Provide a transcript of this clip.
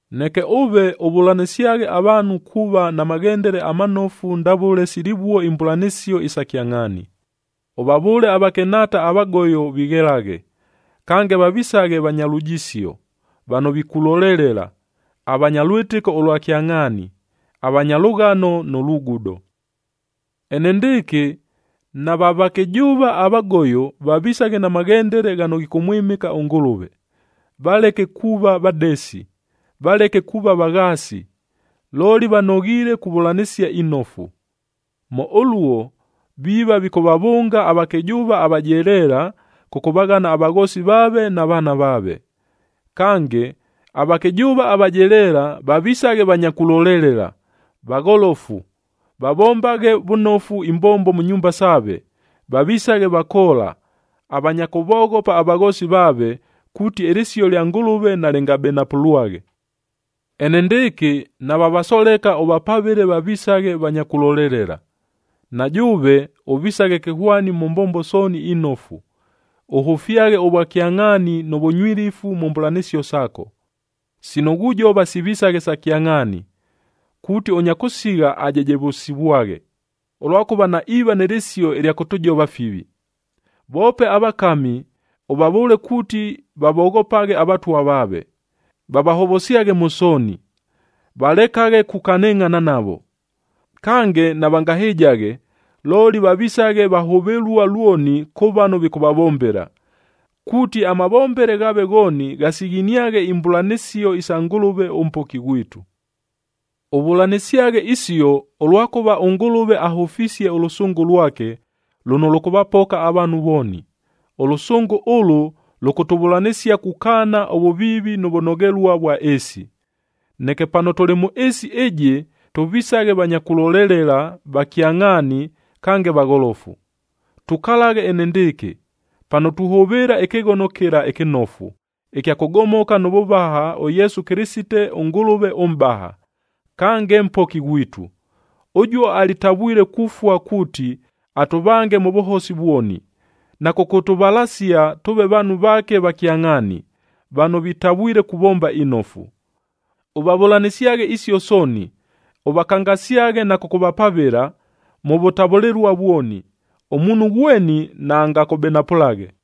Neke ʉve, ʉvʉlanɨsyaghe avaanhu kuuva na maghendele amanofu ndavʉle silivuo imbʉlanɨsio isa kyangʼhaani. Ʉvavʉʉle avakɨnhaata avagoyo vighelaghe, kange vavisaghe vanya lujisio, vano vikulolelela, avanya lwɨtɨko ʉlwa kyangʼhaani, avanya lʉghano nʉ lugudo. Enendɨɨkɨ, nava vakɨjʉʉva avagoyo vavisaghe na maghendele ghano ghikʉmwɨmɨka ʉNgʉlʉve, valeke kuuva vadesi, valeke kuuva vaghaasi, looli vanoghiile kuvʉlanɨsia inofu. Mʉ ʉluo, viiva vikʉvavʉnga avakɨjʉʉva avajeleela kʉkʉvaghana avaghoosi vaave na vaana vaave. Kange, avakɨjʉʉva avajeleela, vavisaghe vanya kulolelela, vagholofu, vavombaghe vʉnofu imbombo mʉ nyumba saave, vavisaghe vakoola, avanya kʉvoghopa avaghoosi vaave, kuuti ɨlɨsio lya Ngʉlʉve nalɨngabenapʉlwaghe. Enendɨɨkɨ, nava vasoleka ʉvapavɨle vavisaghe vanya kulolelela. Na jʉʉve, ʉvisaghe kɨhwani mʉ mbombo sooni inofu, ʉhʉfyaghe ʉvwakyangʼhaani nʉ vʉnywilifu mʉ mbʉlanɨsio saako. Sino ghujova sivisaghe sa kyangʼhaani, kuuti ʉnya kʉsigha ajejevʉsivwaghe, ʉlwakʉva naiiva nɨ lɨsio ɨlya kʉtʉjova fivi. Voope avakami, ʉvavʉʉle kuuti vavoghopaghe avatwa vaave, vavahovosyaghe mʉ sooni, valekaghe kukanɨngʼhana navo. Kange navangahɨjaghe, looli vavisaghe vahʉvɨlua lwoni kʉ vano vikʉvavombela, kuuti amavombele ghaave ghooni ghasighiniaghe imbʉlanɨsio isa Ngʉlʉve ʉMpoki ghwitu. Ʉvʉlanɨsyaghe isio, ʉlwakʉva ʉNgʉlʉve ahʉfisie ʉlʉsʉngʉ lwake, lʉno lʉkʉvapoka avaanhu vooni. Ʉlʉsʉngʉ ʉlʉ, lʉkʉtʉvʉlanɨsia kukaana ʉvʉviivi nʉ vʉnoghelua vwa ɨɨsi. Neke pano tʉlɨ mʉ ɨɨsi ɨjɨ, tʉvisaghe vanya kulolelela, va kyangʼhaani, kange vagholofu. Tukalaghe enendɨɨkɨ, pano tuhʉvɨɨla ɨkɨghono kɨla ɨkɨnofu, ɨkya kʉgomoka nʉ vʉvaha ʉYesu Kɨlɨsite ʉNgʉlʉve ʉMʼbaha, kange Mpoki ghwitu. Ʉjuo alitavwile kufua kuuti, atʉvange mʉ vʉhosi vwoni, na kʉkʉtʉvalasia tʉʉve vaanhu vaake va kyangʼhaani, vano vitavwile kuvomba inofu. Ʉvavʉlanɨsyaghe isio sooni, ʉvakangasyaghe na kʉkʉvapavɨla, mʉ vʉtavʉlɨlua vwoni, ʉmuunhu ghweni naangakʉbenapʉlaghe.